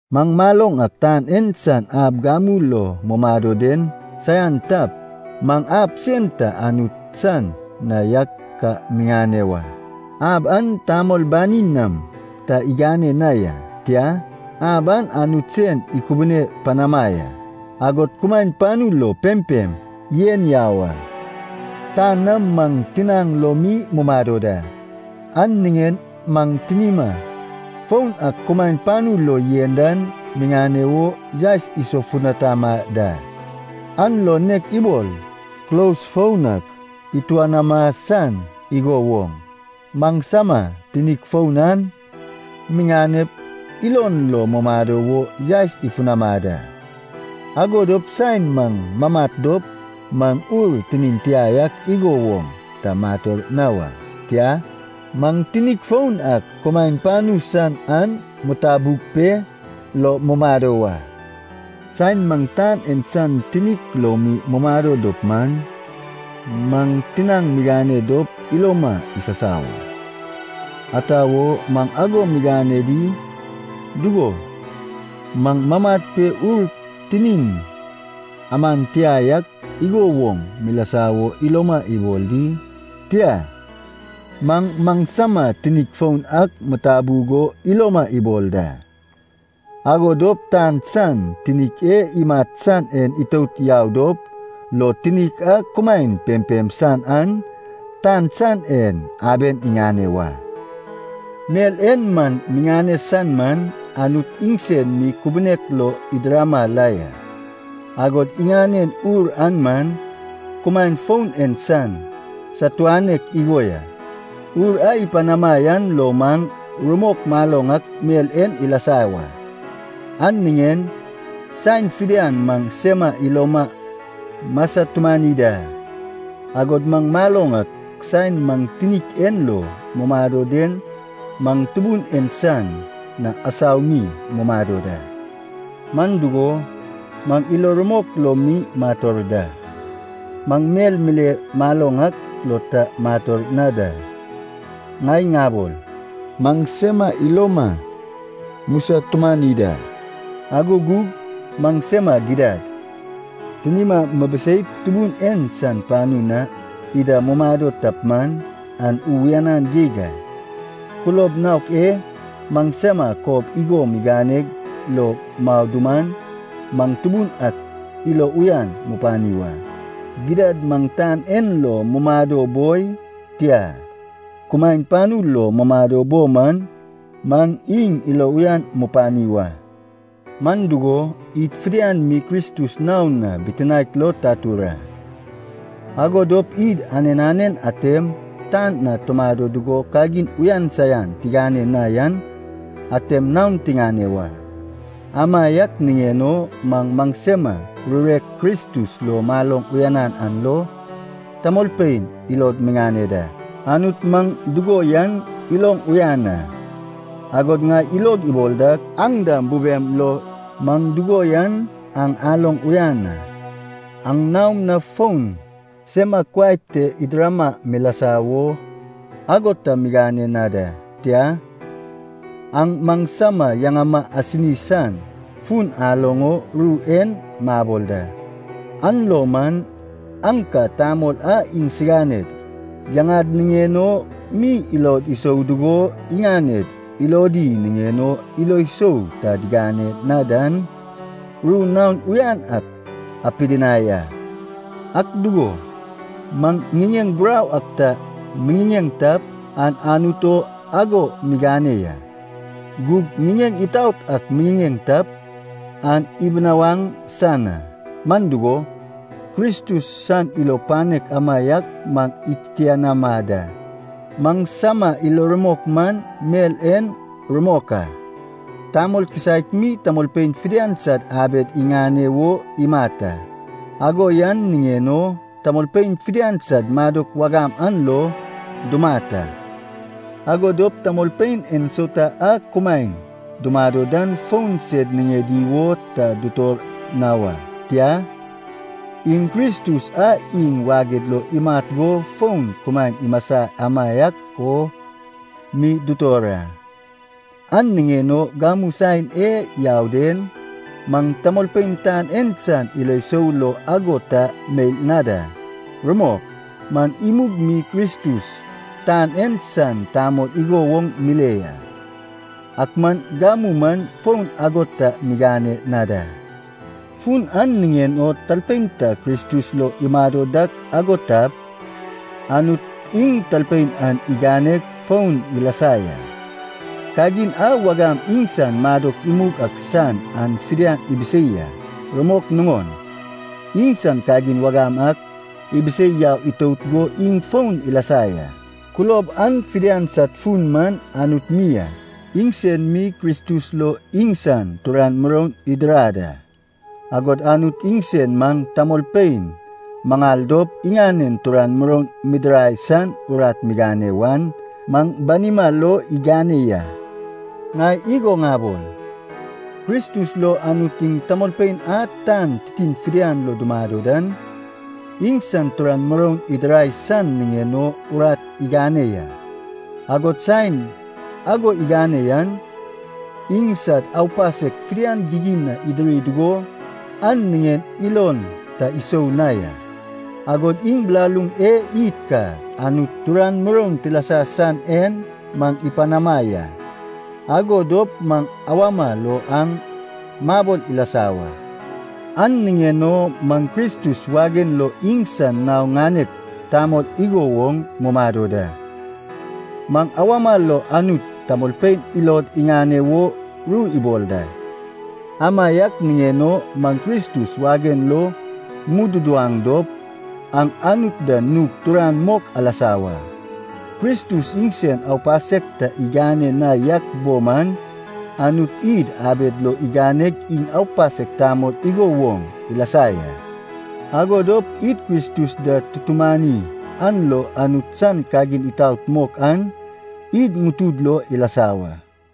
Maŋ maloŋ ak tan en san ab gamu lo mumado den saian tap, maŋ ab sen ta Anut san na yak ka miŋane wa. Ab an tamol banin nam ta igane na ya, tia, ab an Anut sen ikubune panama ya, agod kumaen panu lo pempem yen yau a. Tan na maŋ tinaŋ lo mi mumado da, an niŋen maŋ tinima foun a kumaen panu lo yen dan miŋane wo yaes isofutanama da. An lo nek ibol kulos foun ak ituanama san igo woŋ, maŋsama tinik foun an miŋanep ilon lo mumado wo yaes ifunama da. Ago dop saen maŋ mamat dop maŋ ur tinin tia yak igo woŋ ta mator na wa. Tia, maŋ tinik foun ak kumaen panu san an mitabug pe lo mumado wa. Saen maŋ tan en san tinik lo mi mumado dop man, maŋ tinaŋ migane dop iloma isasau a. Ata wo maŋ ago migane di? Dugo, maŋ mamat pe ur tinin aman tia yak igo woŋ milasa wo iloma ibol di? Tia. Maŋ maŋsama tinik foun ak mitabug o iloma ibol da. Ago dop tan san tinik e imat san en itout yau dop lo, tinik a kumaen pempem san an, tan san en, aben iŋane wa. Mel e maŋ miŋane san man, Anut iŋsen mi kubunek lo idirama la ya. Agod iŋanen Ur an man, kumaen foun en san satuanek igo ya. Ur a ipanama yan lo maŋ rumok maloŋ ak mel en ilasa wa. An niŋen saen fidian maŋ sema iloma musatumani da. Agod maŋ maloŋ ak saen maŋ tinik en lo mumado den maŋ Tubun en san na asau mi mumado da. Man dugo, maŋ ilo rumok lo mi mator da. Maŋ mel mile maloŋ ak lo ta mator na da. Ŋai ŋabol, maŋ sema iloma musatumani da, ago gug maŋsema gidad, tinima mibiseip Tubun en san panu na ida mumado tap man, an uyanan geig a. Kulob naok e maŋsama kob igo miganeg lo mau duman, maŋ Tubun ak ilo uyan mupani wa. Gidad maŋ tan en lo mumado boi, tia, kumaen panu lo mumado bo man, maŋ iŋ ilo uyan mupani wa. Man dugo, id fidian mi Kristus naon na bitinaek lo tatur a, ago dop id anen anen atem tan na tumado dugo kagin uyan saian tigane na yan atem naon tiŋane wa. Amaiak niŋen o maŋ maŋsama rurek Kristus lo maloŋ uyanan an lo, tamolpein ilod miŋane da. Anut maŋ dugo yan iloŋ uyan a, agod ŋai ilog ibol dak aŋ dam bubem lo maŋ dugo yan aŋ aloŋ uyan a. Aŋ naom na fon sema kuai te idirama milasa wo ago ta migane na da, tia, aŋ maŋsama yaŋama asini san fun aloŋ o ru en mabol da. An lo man, aŋ ka tamol a iŋsiganed yaŋad niŋen o mi ilod isou dugo iŋaned ilodi niŋen o ilo sou ta digane na dan, ru naon uyan ak apidinai a. Ak dugo, maŋ ŋiŋeŋ burau ak ta miŋiŋeŋ tap, an Anut o ago migane ya. Gug ŋiŋeŋ itaot ak miŋiŋeŋ tap, an ibinawaŋ san a. Man dugo, Kristus san ilo panek amaiak maŋ ititianama da. Maŋsama ilo rumok man mel en rumok a, tamol kisaek mi tamolpein fidian sad abed iŋane wo imat a. Ago yan niŋen o tamolpein fidian sad madok wagam an lo dumat a. Ago dop tamolpein ensauta a kumaen dumado dan fon sed niŋedi wo ta dutor na wa, tia, iŋ Kristus a iŋ waged lo imat go fon kumaen imasa amaiak o mi dutor a. An niŋen o gamu saen e yau den, maŋ tamolpein tan en san ilo sou lo ago ta meil na da. Rumok, maŋ imug mi Kristus tan en san tamol igo woŋ mile ya, ak man gamu man fon ago ta migane na da. Fun an niŋen o talpein ta Kristus lo imado dak ago tap, Anut iŋ talpein an iganeg foun ilasa ya. Kagin a wagam iŋsan madok imug ak san an fidian ibisei a. Rumok nuŋon, iŋsan kagin wagam ak ibisei yau itout go iŋ foun ilasa ya. Kulob an fidian sad fun man Anut mi a. Iŋsen mi Kristus lo iŋsan turan muroun idirad a. Agod Anut iŋsen maŋ tamolpein maŋal dop iŋanen turan muroun midirai san urat migane wan, maŋ banima lo igane ya. Ŋai igo ŋabol, Kristus lo Anut iŋ tamolpein a tan titin fidian lo dumado dan, iŋsan turan muroun idirai san niŋen o urat igane ya. Agod saen ago igane yan, iŋsad aupasek fidian gigin na idiri dugo an niŋen ilon ta isou na ya. Agod iŋ bilaluŋ e id ka Anut turan muroun tilasa san en maŋ ipanama ya, ago dop maŋ awama lo an mabol ilasa wa. An niŋen o maŋ Kristus wagen lo iŋsan nao ŋanek tamol igo woŋ mumado da. Maŋ awama lo Anut tamolpein ilod iŋane wo ru ibol da. Amaiak niŋen o maŋ Kristus wagen lo mududuwaŋ dop, aŋ Anut da nug turan mok alasa wa. Kristus iŋsen aupasek ta igane na yak bo man, Anut id abed lo iganeg iŋ aupasek tamol igo woŋ ilasa ya. Ago dop id Kristus da tutumani an lo Anut san kagin itaot mok an id ŋutud lo ilasa wa.